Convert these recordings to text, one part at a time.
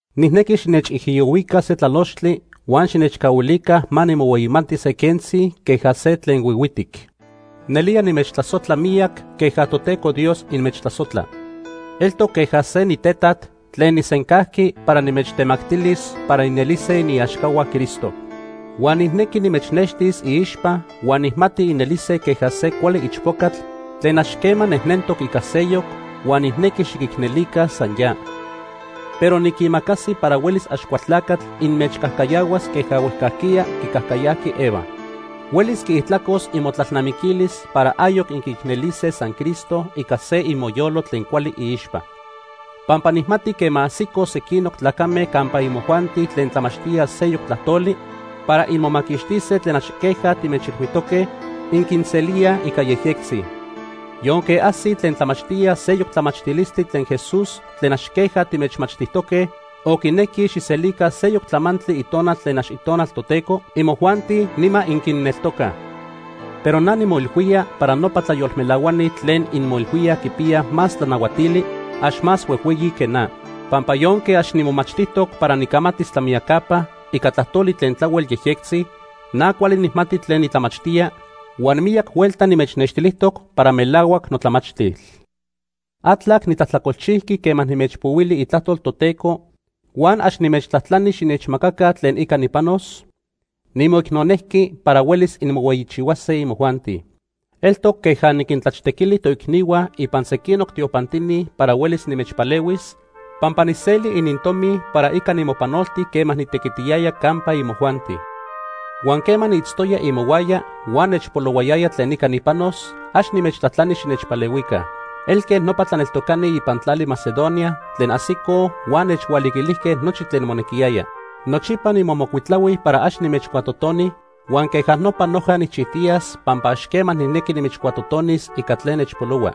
Nijnequi xinechijiyohuica se tlalochtli huan xinechcahuilica ma nimohueyimati se quentzi queja se tlen huihuitic. Nelía nimechtlasojtla miyac queja Toteco Dios inmechtlasojtla. Eltoc queja se nitetat tlen nijsencajqui para nimechtemactilis para inelise iniaxcahua Cristo. Huan nijnequi nimechnextis iixpa huan nijmati inelise queja se cuali ichpocatl tlen ax quema nejnentoc ica seyoc, huan nijnequi xiquicnelica san ya. Pero niquimacasi para huelis Axcualtlacatl inmechcajcayahuas queja huejcajquiya quicajcayajqui Eva. Huelis quiijtlacos imotlalnamiquilis para ayoc inquiicnelise san Cristo ica se imoyolo tlen cuali iixpa. Pampa nijmati quema ajsico sequinoc tlacame campa imojuanti tlen tlamachtíaj seyoc tlajtoli para inmomaquixtise tlen ax queja timechilhuijtoque, inquinselíaj ica yejyectzi. Yonque ajsij tlen tlamachtíaj seyoc tlamachtilistli tlen Jesús tlen ax queja timechmachtijtoque, o quinequij xijselica seyoc tlamantli itonal tlen ax Itonal Toteco, imojuanti nima inquinneltocaj. Pero na nimoilhuía para nopa tlayolmelahuani tlen inmoilhuíaj quipiyaj más tlanahuatili, ax más huejhueyi que na. Pampa yonque ax nimomachtijtoc para nicamatis tlamiyacapa ica tlajtoli tlen tlahuel yejyectzi, na cuali nijmati tlen nitlamachtía, huan miyac huelta nimechnextilijtoc para melahuac notlamachtil. ¿Atlac nitlajtlacolchijqui quema nimechpohuili itlajtol Toteco huan ax nimechtlajtlani xinechmacaca tlen ica nipanos? Nimoicnonejqui para huelis inmohueyichihuase imojuanti. Eltoc queja “niquintlaxtequili” toicnihua ipan sequinoc tiopantini para huelis nimechpalehuis, pampa nijseli inintomi para ica nimopanolti quema nitequitiyaya campa imojuanti. Huan quema niitztoya imohuaya huan nechpolohuayaya tlen ica nipanos, ax nimechtlajtlani xinechpalehuica. Elque nopa tlaneltocani ipan tlali Macedonia tlen ajsicoj huan nechhualiquilijque nochi tlen monequiyaya. Nochipa nimomocuitlahui para ax nimechcuatotoni huan queja nopa noja nijchijtiyas pampa ax quema nijnequi nimechcuatotonis ica tlen nechpolohua.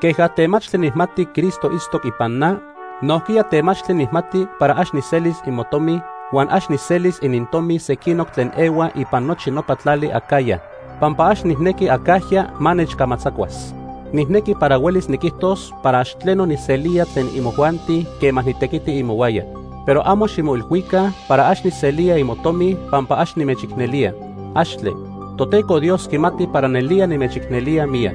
Queja temachtli nijmati Cristo itztoc ipan na, nojquiya temachtli nijmati para ax nijselis imotomi, huan ax nijselis inintomi sequinoc tlen ehua ipan nochi nopa tlali Acaya, pampa ax nijnequi acajya ma nechcamatzacuas. Nijnequi para huelis niquijtos para ax tleno nijselía tlen imojuanti quema nitequiti imohuaya. Pero amo ximoilhuica para ax nijselía imotomi pampa ax nimechicnelía. ¡Axtle! Toteco Dios quimati para nelía nimechicnelía miyac.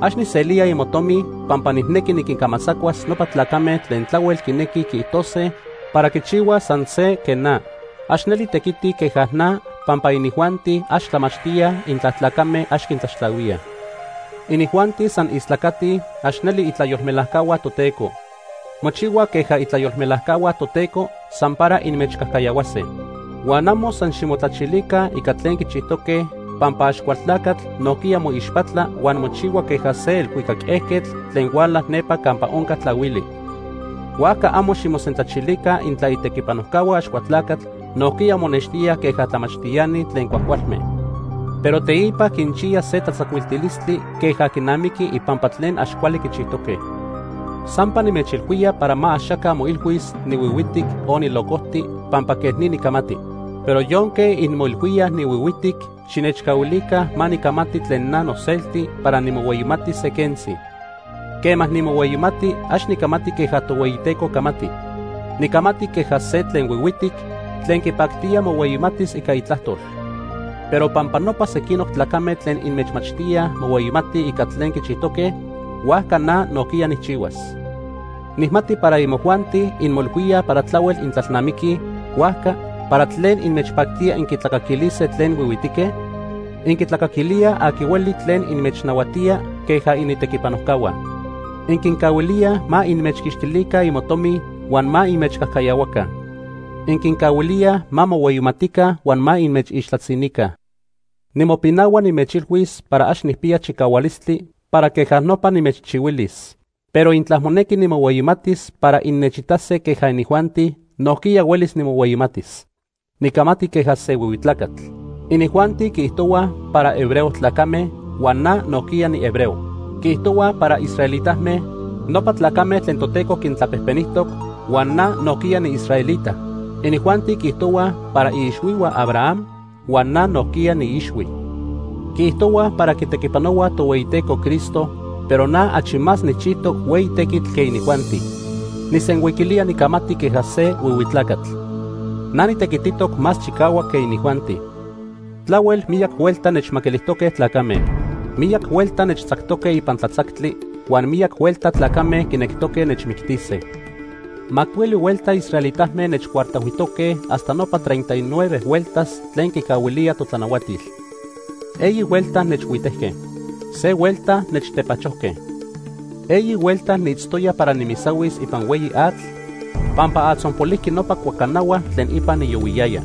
Ax nijselía imotomi pampa nijnequi niquincamatzacuas nopa tlacame tlen tlahuel quinequij quiijtose para quichihuaj san se quej na. Ax neli tequitij queja na, pampa inijuanti ax tlamachtíaj intla tlacame ax quintlaxtlahuíaj. Inijuanti san istlacatij, ax neli itlayolmelajcahua Toteco. Mochihuaj queja itlayolmelajcahua Toteco san para inmechcajcayahuase. Huan amo san ximotlachilica ica tlen quichijtoque, pampa Axcualtlacatl nojquiya moixpatla huan mochihua queja se elhuicac ejquetl tlen huala nepa campa onca tlahuili. Huajca amo ximosentlachilica intla itequipanojcahua Axcualtlacatl nojquiya monextíaj queja tlamachtiani tlen cuajcualme. Pero teipa quinchiya se tlatzacuiltilistli queja quinamiqui ipampa tlen ax cuali quichijtoque. Sampa nimechilhuía para ma axaca moilhuis nihuihuitic o nilocojti pampa quej ni nicamati. Pero yonque inmoilhuíaj nihuihuitic, xinechcahuilica ma nicamati tlen na noselti para nimohueyimatis se quentzi. Quema nimohueyimati, ax nicamati queja Tohueyiteco camati. Nicamati queja se tlen huihuitic tlen quipactía mohueyimatis ica itlajtol. Pero pampa nopa sequinoc tlacame tlen inmechmachtíaj mohueyimatij ica tlen quichijtoque, huajca na nojquiya nijchihuas. Nijmati para imojuanti inmoilhuíaj para tlahuel intlalnamiquij, huajca ¿para tlen inmechpactía inquitlacaquilise tlen huihuitique? Inquitlacaquilíaj aqui hueli tlen inmechnahuatía queja initequipanojcahua. Inquincahuilíaj ma inmechquixtilica imotomi huan ma inmechcajcayahuaca. Inquincahuilíaj ma mohueyimatica huan ma inmechixtlatzinica. Nimopinahua nimechilhuis para ax nijpiya chicahualistli para queja nopa nimechchihuilis. Pero intla monequi nimohueyimatis para innechitase queja inijuanti, nojquiya huelis nimohueyimatis. (Nicamati queja se huihui tlacatl.) Inijuanti quiijtohuaj para hebreo tlacame, huan na nojquiya nihebreo. Quiijtohuaj para israelitame, nopa tlacame tlen Toteco quintlapejpenijtoc, huan na nojquiya niisraelita. Inijuanti quiijtohuaj para iixhuihua Abraham, huan na nojquiya niiixhui. Quiijtohuaj para quitequipanohuaj Tohueyiteco Cristo, pero na achi más nijchijtoc hueyi tequitl que inijuanti. (Nijsenhuiquilía nicamati queja se huihui tlacatl.) Na nitequititoc más chicahuac que inijuanti. Tlahuel miyac huelta nechmaquilijtoque tlacame. Miyac huelta nechtzactoque ipan tlatzactli, huan miyac huelta tlacame quinectoque nechmictise. Macuili huelta israelitame nechcuartajhuijtoque hasta nopa treinta y nueve hueltas tlen quicahuilía totlanahuatil. Eyi huelta nechhuitejque. Se huelta nechtepachojque. Eyi huelta niitztoya para nimisahuis ipan hueyi atl pampa atzonpolijqui nopa cuacanahua tlen ipan niyohuiyaya.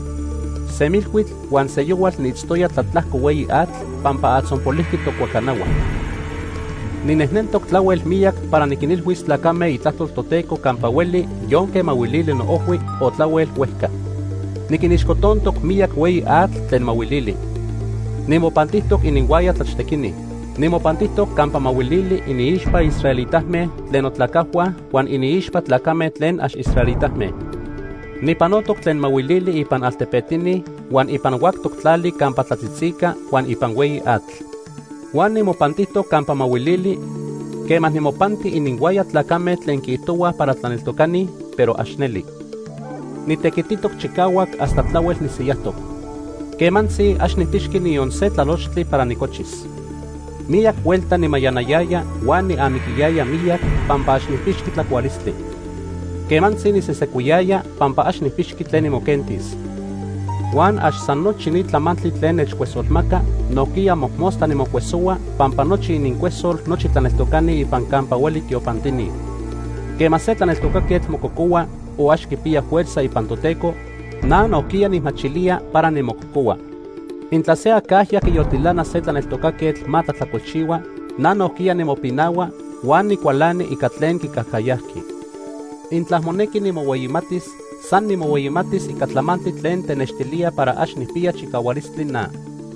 Semilhuitl huan seyohual niitztoya tlatlajco hueyi atl pampa atzonpolijqui tocuacanahua. Ninejnentoc tlahuel miyac para niquinilhuis tlacame itlajtol Toteco campa hueli yonque mahuilili noojhui o tlahuel huejca. Niquinixcotontoc miyac hueyi atl tlen mahuilili. Nimopantijtoc ininhuaya tlaxtequini. Nimopantijtoc campa mahuilili iniixpa israelitame tlen notlacajhua huan iniixpa tlacame tlen ax israelitame. Nijpanotoc tlen mahuilili ipan altepetini, huan ipan huactoc tlali campa tlatzitzica huan ipan hueyi atl. Huan nimopantijtoc campa mahuilili quema nimopanti ininhuaya tlacame tlen quiijtohuaj para tlaneltocani, pero ax neli. Nitequititoc chicahuac hasta tlahuel nisiyajtoc. Quemantzi ax nijpixqui niyon se tlalochtli para nicochis. Miyac huelta nimayanayaya huan niamiquiyaya miyac pampa ax nijpixqui tlacualistli. Quemantzi nisesecuiyaya pampa ax nijpixqui tlen nimoquentis. Huan ax san nochi ni tlamantli tlen nechcuesolmaca, nojquiya mojmostla nimocuesohua pampa nochi inincuesol nochi tlaneltocani ipan campa hueli tiopantini. Quema se tlaneltocaquetl mococohua o ax quipiya fuerza ipan Toteco, na nojquiya nijmachilía para nimococohua. Intla se acajya quiyoltilana se tlaneltocaquetl ma tlajtlacolchihua, na nojquiya nimopinahua huan nicualani ica tlen quicajcayajqui. Intla monequi nimohueyimatis, san nimohueyimatis ica tlamantli tlen tenextilía para ax nijpiya chicahualistli na.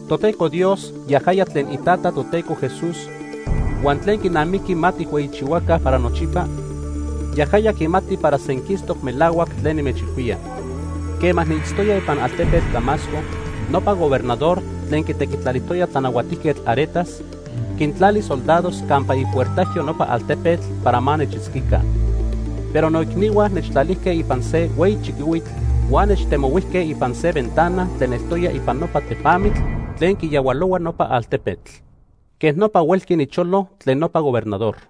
Toteco Dios, yajaya tlen iTata Toteco Jesús huan tlen quinamiqui ma tijhueyichihuaca para nochipa, yajaya quimati para senquistoc melahuac tlen nimechilhuía. Quema niitztoya ipan altepetl Damasco, nopa gobernador tlen quitequitlalijtoya Tlanahuatijquetl Aretas, quintlali soldados campa ipuertajyo nopa altepetl para ma nechitzquica. Pero noicnihua nechtlatijque ipan se hueyi chiquihuitl huan nechtemohuijque ipan se ventana tlen eltoya ipan nopa tepamitl tlen quiyahualohua nopa altepetl. Quej nopa huelqui nicholo tlen nopa gobernador.